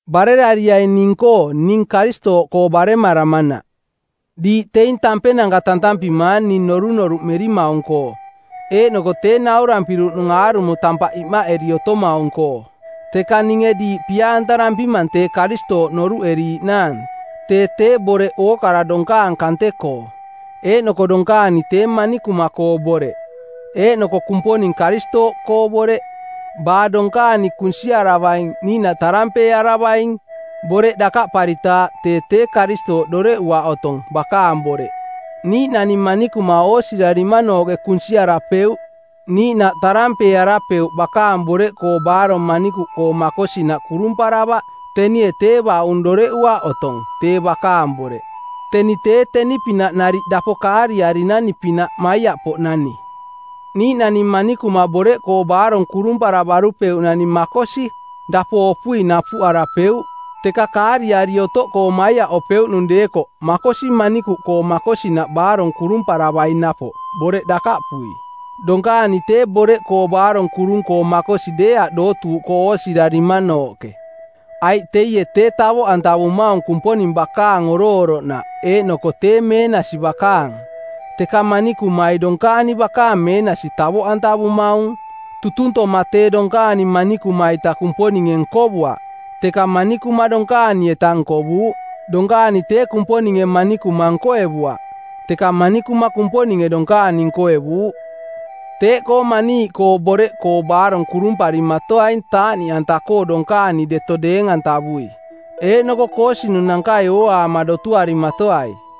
Barerariaing ning-koo ning Karistooꞌkoo baremaramanaꞌ. Diiꞌ teing tampenanka tantampimaang ning norunoruꞌmerimaung-koo eeꞌnoko tee naurampiruꞌnung aarumo tampaꞌ imaꞌeri otomaung-koo. Teka ninge diiꞌ pia-antarampimang tee Karistooꞌ noruꞌeriiꞌnaang tee tee Boreꞌ ookara donkaang kante-koo, eeꞌnoko donkaani tee manikuma-koo boreꞌ, eeꞌnoko Kumponing Karistooꞌkoo boreꞌ. Baa donkaani kunsiaravaing niiꞌnaꞌ tarampeearavaing˜ boreꞌ dakaꞌparitaaꞌ tee tee Karistooꞌ doreꞌuaꞌ otong, bakaang Boreꞌ. Niiꞌnani manikuma oosirarimanooꞌke kunsiarapeuꞌ niiꞌnaꞌ tarampeearapeuꞌ bakaang boreꞌkoo baarong manikuꞌkoo makosinaꞌ kurumparavaꞌ tenie tee baꞌung doreꞌuaꞌ otong, tee bakaang boreꞌ. Teni tee teni-pinaꞌ nariꞌ dapo kaariarinani-pinaꞌ maiaꞌpoꞌnani. Niiꞌnani manikuma boreꞌkoo baarong kurumparavarupeuꞌnani makosi, dapo opui napuꞌarapeuꞌ, teka kaariari otoꞌkoo maiaꞌopeuꞌnung deekoꞌ makosi manikuꞌkoo makosinaꞌ baarong kurumparavaing napoꞌ, boreꞌ dakaꞌpui. Donkaani tee boreꞌkoo baarong kurung-koo makosi deeaꞌ dootuuꞌkoo oosirarimanooꞌke, aiꞌ teie tee tavoꞌantavumaung Kumponing bakaang oroꞌoroꞌnaꞌ eeꞌnoko tee meenasi bakaang; teka manikumai donkaani bakaang meenasi tavoꞌantavumaung. Tutuntoma tee donkaani manikuma-ita Kumponinge nkovuaꞌ, teka manikuma donkaani-eta nkovuuꞌ. Donkaani tee Kumponinge manikuma nkoevuaꞌ, teka manikuma Kumponinge donkaani nkoevuuꞌ. Teeꞌkoo maniiꞌkoo boreꞌkoo baarong kurumparimatoaing taaꞌniꞌanta-koo donkaani deto deeng-antavui, eeꞌnoko koosinunankai ooaama dotuarimatoai.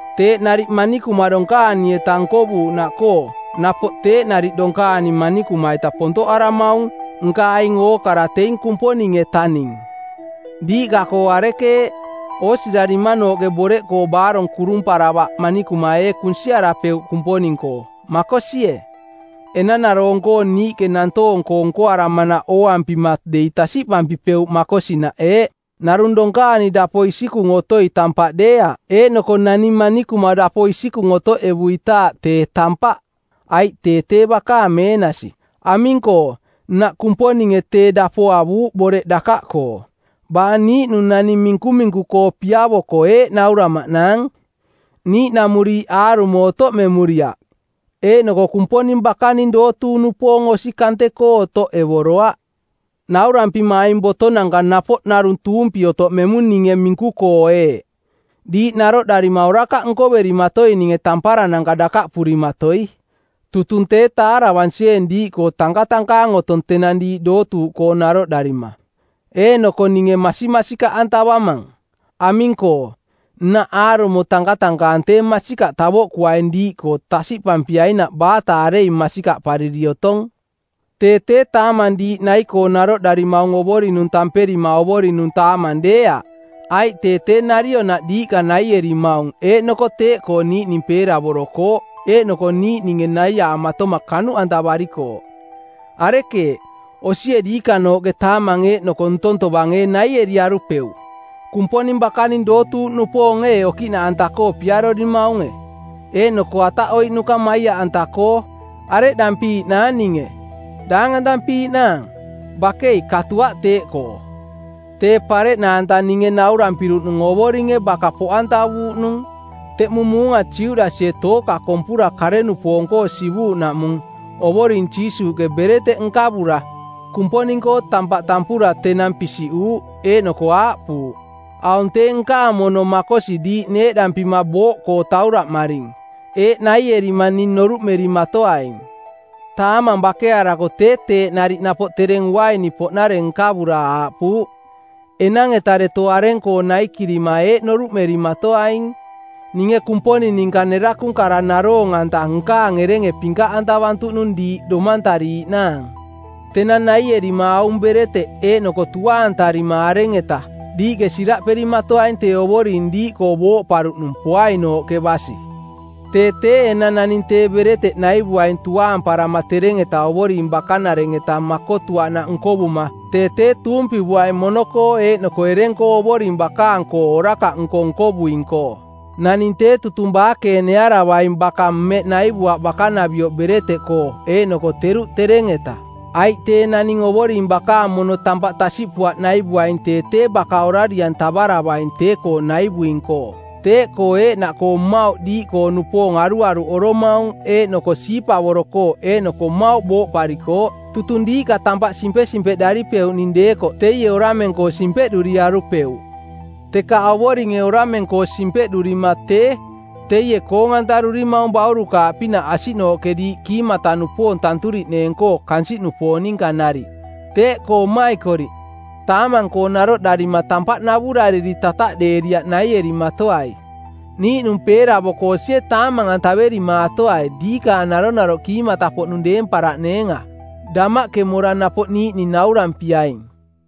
Teeꞌ nariꞌ manikuma donkaani-eta nkovuuꞌnaꞌkoo napoꞌ teeꞌ nariꞌ donkaani manikuma-ita pontoꞌaramaung, nka aing ookara teing Kumponing-etaning. Diiꞌka-koo arekeeꞌ, oosirarimanooꞌke boreꞌkoo baarong kurumparavaꞌ manikuma ee kunsiarapeuꞌ Kumponing-koo, makosie? Enanaroong-koo niiꞌke nantoong-koo nkoaramanaꞌ ooampima dei tasiꞌpampipeuꞌ makosinaꞌ eeꞌ: Narung donkaani dapo isikung otoi tampaꞌ deeaꞌ, eeꞌnoko nani manikuma dapo isikung otoꞌevuitaaꞌ tee tampaꞌ, aiꞌ tee tee bakaang meenasi. Aming-koo, nnaꞌ Kumponinge tee dapo avuuꞌ boreꞌ dakaꞌkoo. Baa niiꞌnung naning minkuminku-koo piavoko eeꞌ nauramaꞌnaang, “Niiꞌnamuriiꞌ aarumo otoꞌmemuriaꞌ, eeꞌnoko Kumponing bakaning dootuuꞌnupoong osi kante-koo otoꞌevoroaꞌ.” Naurampima aing botovotonanka napoꞌ narung tuumpi otoꞌmemung ninge minku-koo eeꞌ: Diiꞌ naroꞌdarima orakaꞌ nkoverimatoininge tamparananka dakaꞌpurimatoi. Tutung tee taaravansieeng diiꞌkoo tankatankaang otong tenang diiꞌ dootuuꞌkoo naroꞌdarima, eeꞌnoko ninge masimasikaꞌantavamang. Aming-koo, nnaꞌ aarumo tankatankaang tee masikaꞌ tavoꞌkuaing diiꞌkoo tasiꞌpampiainaꞌ baata areing masikaꞌpariri otong. Tee tee taamang diiꞌ nai-koo naroꞌdarimaung Ovoring-nung tamperima Ovoring-nung taamang deeaꞌ, aiꞌ tee tee narionaꞌ diiꞌka naierimaung eeꞌnoko teeꞌkoo niiꞌning peeravorokooꞌ eeꞌnoko niiꞌninge naiaamatoma kanuꞌantavarikooꞌ. Arekeeꞌ, osie diikanooꞌke taamang eeꞌnoko ntong tovang ee naieriarupeuꞌ? Kumponing bakaning dootuuꞌnupoong ee okiꞌnaꞌanta-koo piarorimaunge, eeꞌnoko ataꞌoiꞌnuka maiaꞌanta-koo? Areꞌdampiiꞌnaang ninge; daangantampiiꞌnaang? Bakei, katuaꞌ teeꞌkoo. Tee pareꞌnaanta ninge naurampiruꞌnung Ovoringe baka poꞌantavuuꞌnung. Teꞌmung muunga Judasie tooka kompura kare-nupoong-koo sivuuꞌnaꞌmung Ovoring Jiisuuꞌke bereteꞌ nkavura, Kumponing-koo tampaꞌ, tampura tenang pisiꞌuuꞌ eeꞌnoko aaꞌpuuꞌ, “Aung tee nkaang mono makosi diiꞌ neeꞌdampima booꞌkoo tauraꞌmaring. Eeꞌ naierima ning noruꞌmerimatoaing.” Taamang bakearako tee teeꞌ nariꞌ napoꞌ tereng uaini-poꞌnareng nkavura aaꞌpuuꞌ, “Enang-eta deto areng-koo naikirima eeꞌ noruꞌmerimatoaing, ninge Kumponing ninka nerakung kara naroong-anta nkaang erenge pinkaꞌantavantuꞌnung diiꞌ domantariiꞌnaang.” Tenang naierima aung bereteꞌ eeꞌnoko tuaantarima areng-etaꞌ diiꞌke siraꞌperimatoaing tee Ovoring diiꞌkoo booꞌparuꞌnung poainooꞌke basi. Tee tee enang naning tee bereteꞌ naivuaing tuaamparama tereng-eta Ovoring bakanareng-eta makotuaꞌnaꞌ nkovuma tee tee tuumpivuaing mono-koo eeꞌnoko ereng-koo Ovoring bakaang-koo orakaꞌnko nkovuing-koo. Naning tee tutung baakeenearavaing baka mmeꞌ naivuaꞌ bakanavioꞌ bereteꞌkoo eeꞌnoko teruꞌ tereng-eta. Aiꞌ tee naning Ovoring bakaang mono tampaꞌ tasiꞌpuaꞌ naivuaing tee tee baka orari-antavaravaing tee-koo naivuing-koo. Teeꞌkoo eeꞌnaꞌkoo mmauꞌ diiꞌkoo-nupoong aruaruꞌoromaung eeꞌnoko siipavorokooꞌ eeꞌnoko mmauꞌ booꞌparikooꞌ. Tutung diiꞌka tampaꞌ simpesimpeꞌdaripeuꞌning deekoꞌ teie orameng-koo simpeꞌduriarupeuꞌ. Teka Ovoringe orameng-koo simpeꞌdurima tee, teie koong-antarurimaung baurukaaꞌpinaꞌ asiꞌnooꞌke diiꞌ kiimata-nupoong tanturiꞌneeng-koo kansiꞌnupoong ninka nariꞌ. Teeꞌkoo mmaikoriꞌ, taamang-koo naroꞌdarima tampaꞌ navurariri tataꞌdeeriaꞌ naierimatoai. Niiꞌnung peeravoko osie taamang-antaverimatoai diikaang naronaroꞌ kiimata-poꞌnung deemparaꞌneenga. Damaꞌke mora napoꞌ niiꞌning naurampiaing.